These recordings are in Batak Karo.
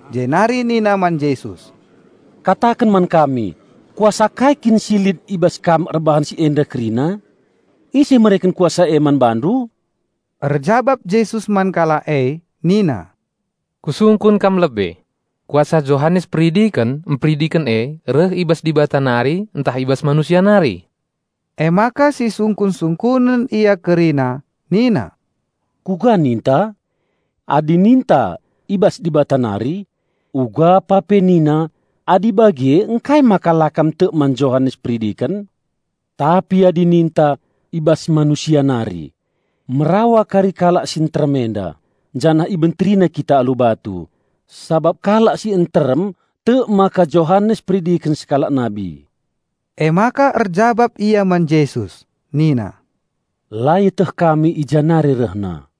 jenari nina man Jesus, "Kataken man kami, kuasa kai kin si lit i bas Kam erbahan si enda kerina? Ise mereken kuasa e man Bandu?" Erjabap Jesus man kalak e nina, "Kusungkun kam lebe. Kuasa Johanes Peridiken mperidiken e reh i bas Dibata nari, ntah i bas manusia nari?" Emaka sisungkun-sungkunen ia kerina nina, "Kuga ninta? Adi ninta, 'I bas Dibata nari,' ugapa pe nina, 'Adi bage ngkai maka la kam tek man Johanes Peridiken.' Tapi adi ninta, 'I bas manusia nari,' merawa kari kalak si nterem enda janah ibenterina kita alu batu, sabap kalak si nterem tek maka Johanes Peridiken sekalak nabi." Emaka erjabap ia man Jesus nina, "La ieteh kami i ja nari rehna."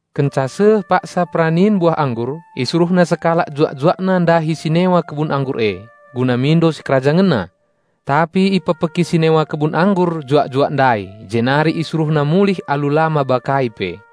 Kenca seh paksa peranin buah anggur, isuruhna sekalak juak-juakna ndahi si newa kebun anggur e, guna mindo sikerajangenna. Tapi ipekpeki si newa kebun anggur juak-juak ndai jenari isuruhna mulih alu la maba kai pe.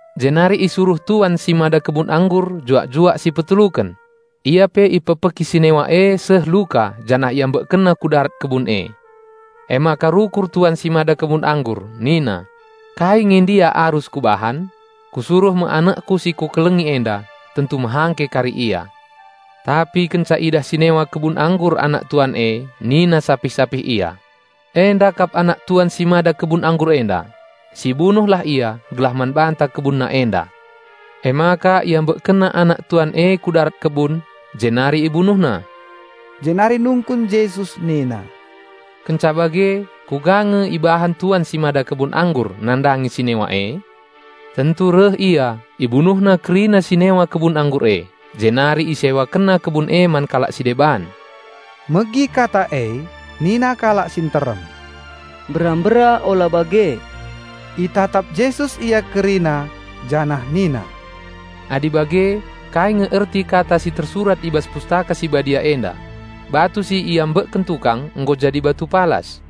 Jenari isuruh tuan si mada kebun anggur juak-juak si peteluken. Ia pe ipekpeki si newa e seh luka janah iambekkenna ku darat kebun e. Emaka rukur tuan si mada kebun anggur nina, 'Kai nge ndia arus kubahan? Kusuruh me anakku si kukelengi enda; tentu mehangke kari ia.' Tapi kenca idah si newa kebun anggur anak tuan e nina sapih-sapih ia, 'Enda kap anak tuan si mada kebun anggur enda. Sibunuhlah ia gelah man banta kebunna enda!' Emaka iambekkenna anak tuan e ku darat kebun, jenari ibunuhna." Jenari nungkun Jesus nina, "Kenca bage kuga nge ibahan tuan si mada kebun anggur nandangi si newa e? Tentu reh ia, ibunuhna kerina si newa kebun anggur e, jenari isewakenna kebun e man kalak si deban." Megi kata e nina kalak si nterem, "Mbera-mbera ola bage!" Itatap Jesus ia kerina janah nina, "Adi bage, kai nge erti kata si tersurat i bas Pustaka Si Badia enda? 'Batu si iambekken tukang, nggo jadi batu palas.'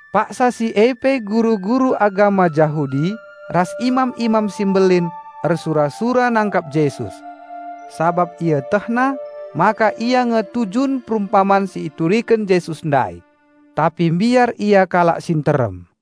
Paksa si e pe guru-guru agama Jahudi ras imam-imam si mbelin ersura-sura nangkap Jesus. Sabap ietehna maka ia nge tujun perumpaman si ituriken Jesus ndai. Tapi mbiar ia kalak si nterem.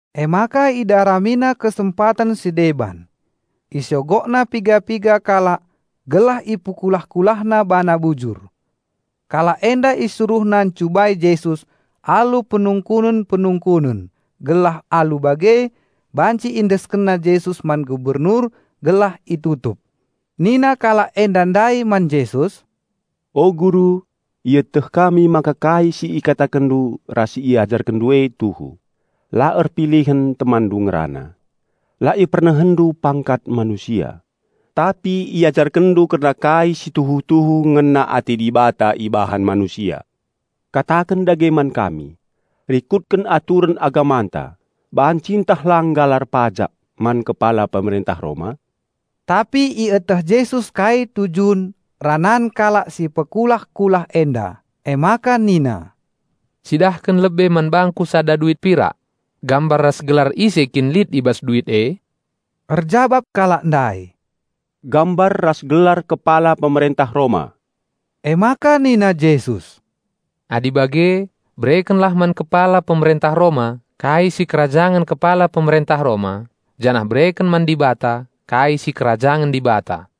Emaka idaramina kesempaten si deban. Isogokna piga-piga kalak gelah ipekulah-kulahna bana bujur. Kalak enda isuruhna ncubai Jesus alu penungkunen-penungkunen, gelah alu bage banci iendeskenna Jesus man gubernur gelah itutup. Nina kalak enda ndai man Jesus, "O Guru, ieteh kami maka kai si ikatakenndu ras si IajarkenNdu e tuhu. La erpilihen TemanNdu ngerana. La IpernehenNdu pangkat manusia, tapi IajarkenNdu kerna kai si tuhu-tuhu ngena ate Dibata ibahan manusia. Kataken dage man kami, rikutken aturen agamanta banci ntah lang galar pajak man Kepala Pemerentah Roma?" Tapi ieteh Jesus kai tujun ranan kalak si pekulah-kulah enda, emaka nina, "Cidahken lebe man bangKu sada duit pirak. Gambar ras gelar ise kin lit i bas duit e?" Erjabap kalak ndai, "Gambar ras gelar Kepala Pemerentah Roma." Emaka nina Jesus, "Adi bage, berekenlah man Kepala Pemerentah Roma kai sikerajangen Kepala Pemerentah Roma janah bereken man Dibata kai sikerajangen Dibata."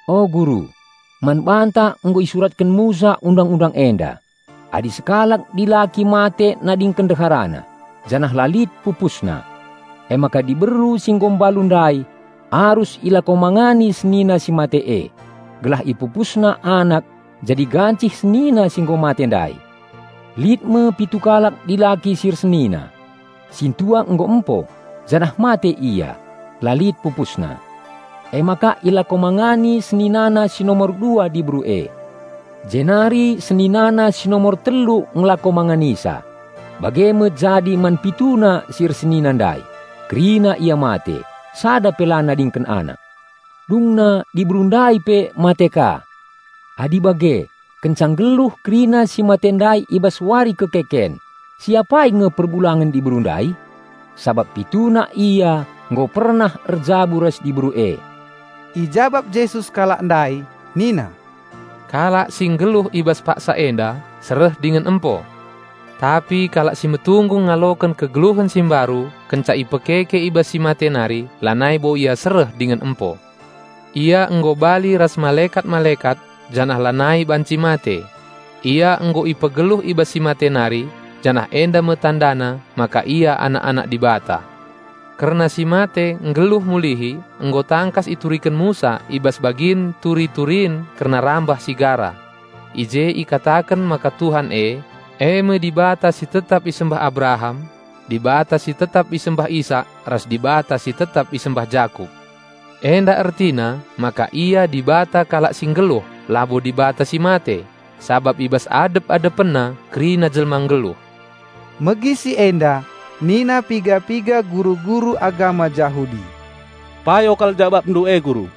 "O Guru, man banta nggo isuratken Musa Undang-undang enda, 'Adi sekalak dilaki mate nadingken ndeharana, janah la lit pupusna, emaka diberu si nggo mbalu ndai arus ilakomangani senina si mate e gelah ipupusna anak jadi gancih senina si nggo mate ndai.' Lit me pitu kalak dilaki si ersenina. Sintua nggo empo, janah mate ia, la lit pupusna. Emaka ilakomangani seninana si nomor dua diberu e, jenari seninana si nomor telu ngelako manganisa. Bage me jadi man pituna si ersenina ndai -- kerina ia mate, sada pe la nadingken anak. Dungna diberu ndai pe mate ka. Adi bage, kenca nggeluh kerina si mate ndai i bas wari kekeken, si apai nge perbulangen diberu ndai? Sabap pituna ia nggo pernah erjabu ras diberu e." Ijabap Jesus kalak ndai nina, "Kalak si nggeluh i bas paksa enda sereh dingen empo. Tapi kalak si metunggung ngaloken kegeluhen si mbaru kenca ipekeke i bas si mate nari lanai bo ia sereh dingen empo. Ia nggo bali ras malekat-malekat janah lanai banci mate. Ia nggo ipegeluh i bas si mate nari, janah enda me tandana maka ia anak-anak Dibata. Kerna si mate nggeluh mulihi nggo tangkas ituriken Musa i bas bagin turi-turin kerna rambah si gara. I je ikataken maka Tuhan e, e me Dibata si tetap isembah Abraham. Dibata si tetap isembah Isak ras Dibata si tetap isembah Jakup. Enda ertina maka Ia Dibata kalak si nggeluh labo Dibata si mate, sabap i bas adep-AdepenNa kerina jelma nggeluh." Megi si enda nina piga-piga guru-guru agama Jahudi, "Payo kal JabapNdu e Guru!"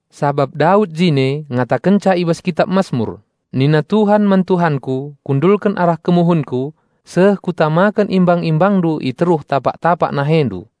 Sabap Daud jine ngatakenca i bas kitap Masmur, 'Nina TUHAN man TuhanKu Kundulken arah kemuhenKu seh Kutamaken imbang-ImbangNdu i teruh tapak-tapak NaheNdu.'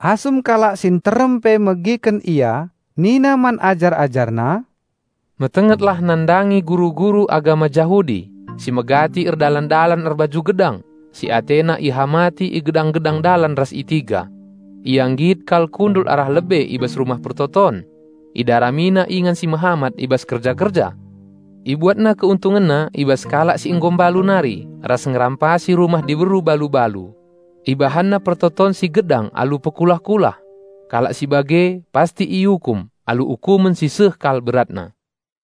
Asum kalak si nterem pe megiken Ia nina man ajar-AjarNa, "Metengetlah nandangi guru-guru agama Jahudi, si megati erdalan-dalan erbaju gedang, si atena ihamati i gedang-gedang dalan ras itiga. Ia nggit kal kundul arah lebe i bas rumah persembahen. Idaramina ingan si mehamat i bas kerja-kerja. Ibuatna keuntungenna i bas kalak si nggo mbalu nari ras ngerampasi rumah diberu balu-balu. Ibahanna pertoton si gedang alu pekulah-kulah. Kalak si bage pasti iukum alu ukumen si seh kal beratna."